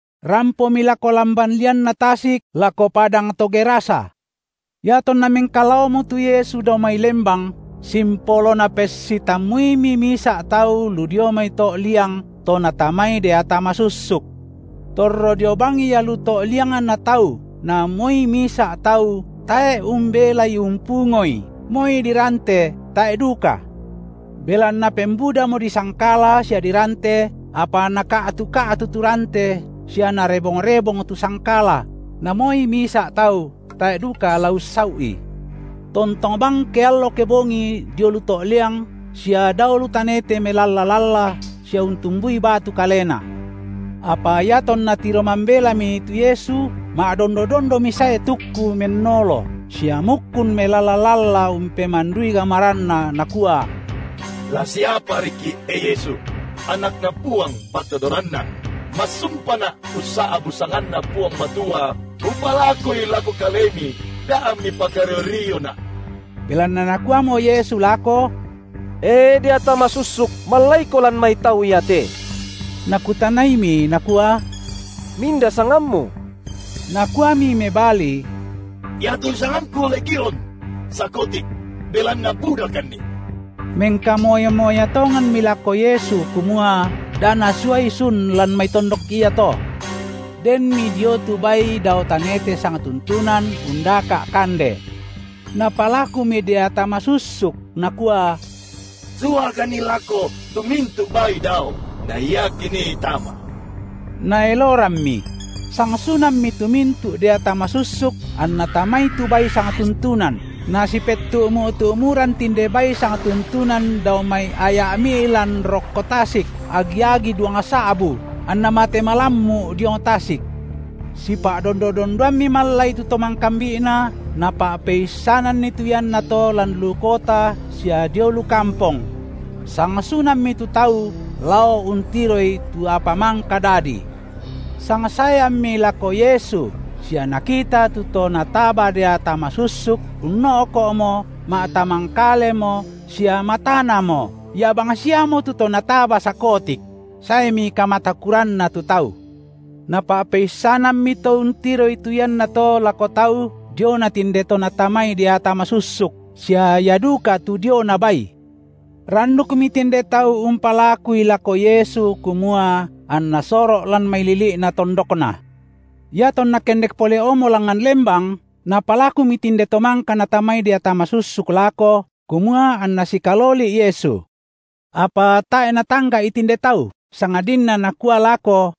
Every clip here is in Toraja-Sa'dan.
Rampomi lako lamban lianna tasik lako padang to Gerasa. Iatonna mengkalaomo tu Yesu dao mai lembang simpolo napessitammuimi misa’ tau lu dio mai to’ liang to natamai deata masussuk. Torro dio bang ia lu to’ liangna tau na moi misa’ tau tae’ umbelai umpungoi, moi dirante tae’ duka. Belanna pembudamo disangkala sia dirante, apa naka’tu-ka’tu tu rante sia narebong-rebong tu sangkala, na moi misa’ tau tae’ duka la ussau’i. Tontong bang keallo kebongi dio lu to’ liang sia dao lu tanete melalla-lalla sia untumbui batu kalena. Apa iatonna tiro mambelami tu Yesu, ma’dondo-dondomi sae tukku, mennolo, sia mukkun melalla-lalla umpemandui gamaranna nakua: La siapariki’, e Yesu, Anakna Puang Patodoranna! Massumpana’ ussa’bu’ sanganNa Puang Matua umpalakui lako Kalemi da’ amMi pakario-riona’. Belanna Nakuamo Yesu lako: E deata masussuk, mallaiko lan mai tau iate. Nakutanaimi Nakua: Minda sangammu? Nakuami mebali: Iatu sangangku Legiun (Sakotik), belanna budakanni. Mengkamoya-moya tonganmi lako Yesu, kumua da Nasuai sun lan mai tondok iato. Denmi dio tu bai dao tanete sangtuntunan undaka’ kande. Napalakumi deata masussuk nakua: Suakanni lako to mintu’ bai dao, na ia kinii tama. Naelorammi. Sangsunammi tu mintu’ deata masussuk anna tamai tu bai sangtuntunan, na sipettu’mu’-tu’muran tinde bai sangtuntunan dao mai aya’ mi’lan rokko tasik, agi-agi duangsa’bu, anna mate malammu’ diong tasik. Sipa’dondo-dondoammi mallai tu to mangkambi’na, napa’peissananni tu iannato lan lu kota sia dio lu kampong. Sangsunammi tu tau lao untiroi tu apa mangka dadi. Sangsaeammi lako Yesu sia nakita tu to nataba deata masussuk unno’ko’mo ma’tamangkalemo sia matanamo, ia bangsiamo tu to nataba sakotik; saemi kamatakuranna tu tau. Napa’peissanammi to untiroi tu iannato lako tau diona tinde to natamai deata masussuk, sia ia duka tu diona bai. Randukmi tinde tau umpalakui lako Yesu kumua anna soro’ lan mai lili’na tondokna. Iatonna kendek pole’mo langngan lembang, napalakumi tinde to mangka natamai deata masussuk lako kumua anna sikaloli’ Yesu. Apa tae’ Natangga’i tinde tau, sangadinna Nakua lako: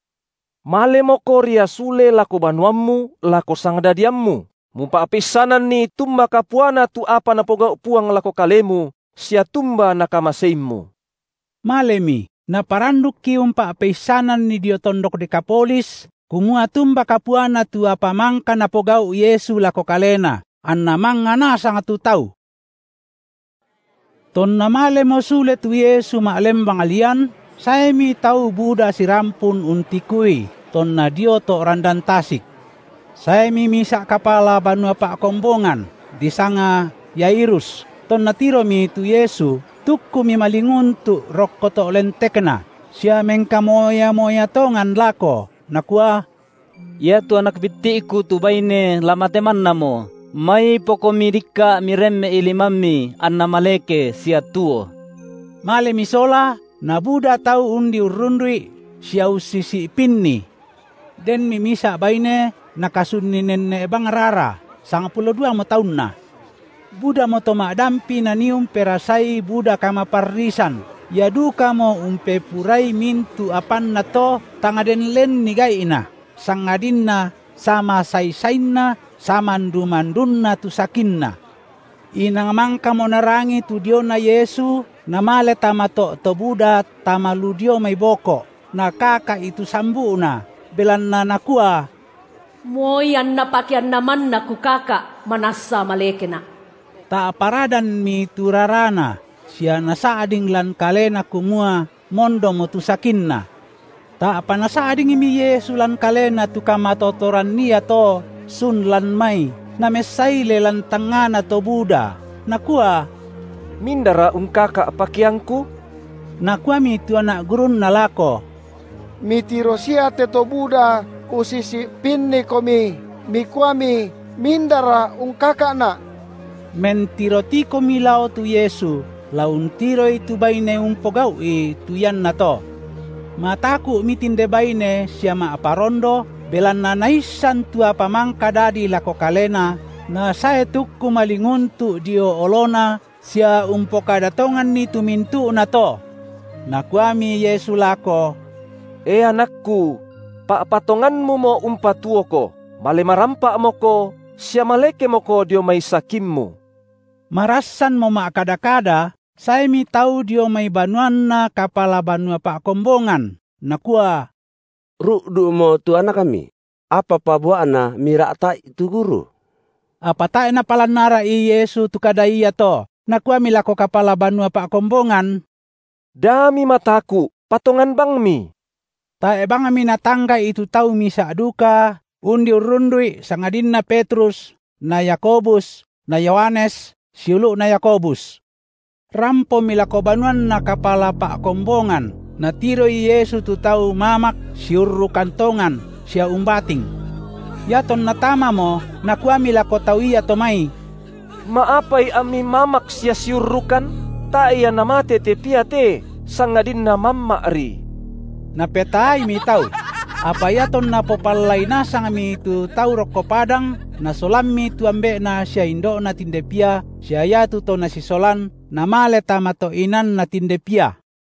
Malemoko ria sule lako banuammu lako sangdadiammu, mupa’peissananni tumba kapuana tu apa Napogau’ Puang lako kalemu sia tumba Nakamaseimmu. Malemi, naparandukki umpa’peissananni dio tondok Dekapolis, kumua tumba kapuana tu apa mangka Napogau’ Yesu lako kalena, anna mangnga nasang tu tau. Tonna malemo sule tu Yesu ma’lembang lian, saemi tau buda sirampun untikui, tonna dio to’ randan tasik. Saemi misa’ kapala banua pa’kombongan, disanga Yairus, tonna tiromi tu Yesu tukkumi malinguntu’ rokko to’ lentekNa, sia mengkamoya-moya tongan lako nakua: Iatu anak bitti’ku tu baine la mate mannamo, maipoKomi dikka’ Miremme’i limamMi anna maleke sia tuo. Malemi sola, nabuda tau undi urrundu’I sia ussisi’pinni. Denmi misa’ baine nakasunni nenne’ bang rara, sangpulo duamo taunna. Budamo to ma’dampi nanii umperasai buda kamaparrisan, ia dukamo umpepurai mintu’ apanna to, tang den lenni gai’na, sangadinna samasai-sainna samandu-mandunna tu sakinna. Inang mangkamo narangi tu diona Yesu, namale tama to’ to buda tama lu dio mai boko’, nakaka’i tu sambu’Na, belanna nakua: Moi anna pakeanNa manna kukaka’, manassa malekena’. Ta’pa radanmi tu rarana sia nasa’ding lan kalena kumua mondomo tu sakinna. Ta’pa Nasa’dingmi Yesu lan Kalena tu kamatotoran iato sun lan mai, namessaile lan tangngana to buda, Nakua: Mindara ungkaka’ pakeangKu? Nakuami tu anak gurunNa lako: Mitiro sia te to buda ussisi’pinniKomi, Mikuami: mindara ungkaka’Na’? Mentiro tikumi lao tu Yesu, la untiroi tu baine umpogau’i tu iannato. Mataku’mi tinde baine sia ma’parondo, belanna naissan tu apa mangka dadi lako kalena nasae tukku malinguntu’ dio oloNa sia umpokada tonganni tu mintu’nato. Nakuami Yesu lako: E anakKu! pa’patonganmumo umpatuoko; male marampa’moko sia malekemoko dio mai sakimmu. Marassanmo ma’kada-kada, saemi tau dio mai banuanna kapala banua pa’kombongan, nakua: Ru’du’mo tu anakmi; apapa bua’na mira’ta’i tu Guru? Apa tae’ Napalan ara’i Yesu tu kada iato, Nakuami lako kapala banua pa’kombongan: Da mimataku’, patongan bangmi. Tae’ bangmi Natangga’i tu tau misa’ duka undi urrundu’I sangadinna Petrus na Yakobus na Yohanes, siulu’na Yakobus. Rampomi lako banuanna kapala pa’kombongan, Natiroi Yesu tu tau mamak siurrukan tongan sia umbating. Iatonna tamamo, Nakuami lako tau iato mai: Ma’apai ammi mamak sia siurrukan? Tae’ ia namate te pia te, sangadinna mamma’ri. Napetaaimi tau. Apa iatonna popallai nasangmi tu tau rokko padang, Nasolammi tu ambe’na sia indo’na tinde pia sia iatu to Nasisolan Namale tama to’ inanna tinde pia.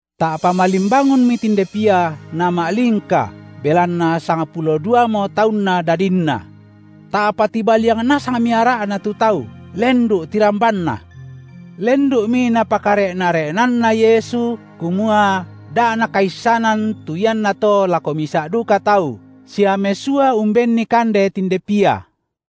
Ta’pa malimbangunmi tinde pia nama’lingka belanna sangpulo duamo taunna dadinna. Ta’pa tibaliang nasangmi ara’na tu tau, lendu’ tirambanna. Lendu’mi Napakare’na-re’nanna Yesu, kumua da’ nakaissanan tu iannato lako misa’ duka tau, sia mesua umbenni kande tinde pia.